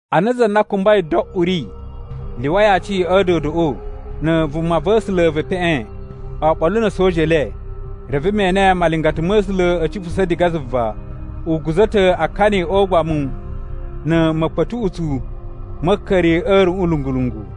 Ana za na kumbai do uri lyuwai aci a̱ a̱a̱dodoꞌo, na̱ vumava̱sula̱ ve epeꞌen, oɓolo na̱ a̱soja e le, reve me ene malingata ma̱ A̱sula̱ a̱ cipusa̱ diga zuva, u guza̱ ta̱ akani o ugbamu na̱ ma̱kpa̱tuꞌutsu ma̱ a̱a̱ka̱ri a̱ a̱ruꞌun lungu-lungu.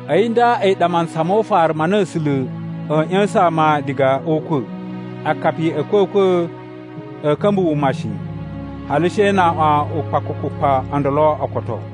A̱yi nda a̱yi ɗa mantsa mo ufaru ma na A̱sula̱ a̱a̱ ꞌya̱sa̱n ama diga o ukwa̱. (Akapi a̱ a̱kwa̱kwa̱ a̱a̱ ka̱mba̱ wuma shi, hali she na aꞌwan ukpakukupa o ndolo o koto.)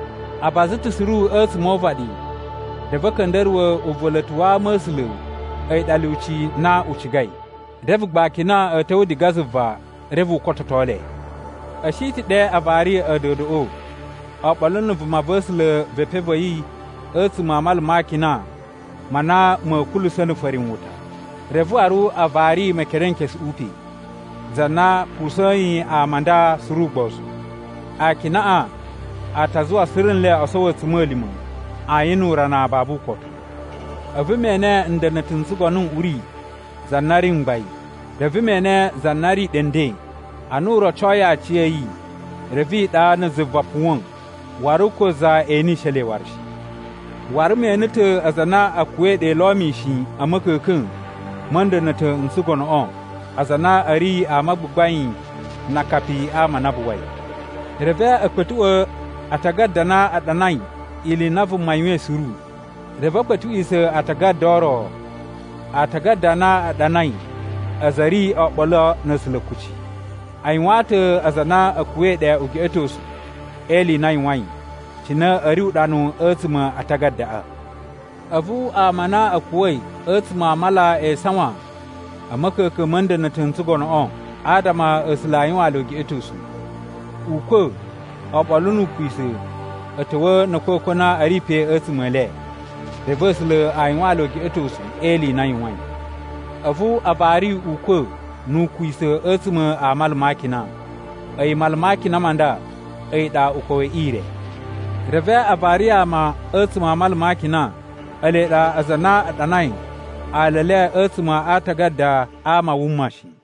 A baza ta̱ suru a̱tsuma̱ o uvaɗi reve a̱ ka̱nda̱ruwa̱ uva̱la̱ta̱ wa ama a̱ A̱sula̱ a̱yi ɗa lyuci na u cigai. Reve gba akina a̱ ta̱wa̱ diga zuva reve u kototo le. A̱ shi ta̱ ɗe a vari a̱a̱dodoꞌo oɓolo na̱ vumava̱sula̱ ve epen va̱ yi a̱tsuma̱ a mala ma akina ma na ma̱ kulusa̱ na̱ farinwuta, reve waru a vari Mekerenkesuꞌu pe, za na pusa̱yin ama a nda suru ugbozu. Akinaꞌa a ta zuwa suru nle o sowo a̱tsuma̱lima̱ ayin nu urana babu ukotu. A̱vu me ene nda̱na̱ta̱ n tsugono n uri za na ri mgbain, reve me ene za na ri ɗe nden. Ana u rocoyi aciya̱yi, reve iɗa na̱ zuva puwa̱n waru ko za enishe le waru shi. Waru me ene ta̱ aza a na a̱ kuwa̱i ɗe lo mishin a̱ ma̱ka̱ka̱n ma̱ nda̱na̱ta̱ n tsugonoꞌo, aza a na a̱ ri ama a gbagbain na akapi a ama a na a buwai. Reve a̱ kpa̱tuꞌwa̱ atagada a na a ɗanai ili i na vuma yuwain suru. Reve a̱ kpa̱tuꞌwisa̱ aatagada o ro, aatagada a na a ɗanai aza a̱ ri oɓolo na̱ A̱sula̱ kuci. A yuwaan ta̱ aza a na a̱ kuwa̱i ɗe ugeꞌetosu e ili i na a yuwain, cine a̱ ri uɗanu a̱tsuma̱ a atagadaꞌa. A̱vu ama a na a̱ kuwa̱i a̱tsuma̱ a mala e isawan a̱ ma̱ka̱ka̱n ma̱ nda̱na̱ta̱ n tsugonoꞌo, adama A̱sula̱ a yuwaan le ugeꞌetosu. Ukwa̱ oɓolo nu Ukwisa̱ a̱ ta̱wa̱a̱ na̱ a̱kwa̱kwa̱ a na a̱ ri pe a̱tsuma̱ e le, reve A̱sula̱ a yuwaan le ugeꞌetosu e ili i na a yuwain. A̱vu a vari Ukwa̱ nu Ukwisa̱ a̱tsuma̱ a mala ma akina. (A̱yi mala ma akina ma nda, a̱yi ɗa ukwa̱ we ire.) Reve a vari ama a̱tsuma̱ a mala ma akina, ele ɗa aza a na a ɗanai ala e le a̱tsuma̱ a aatagada a ama a wuma shi.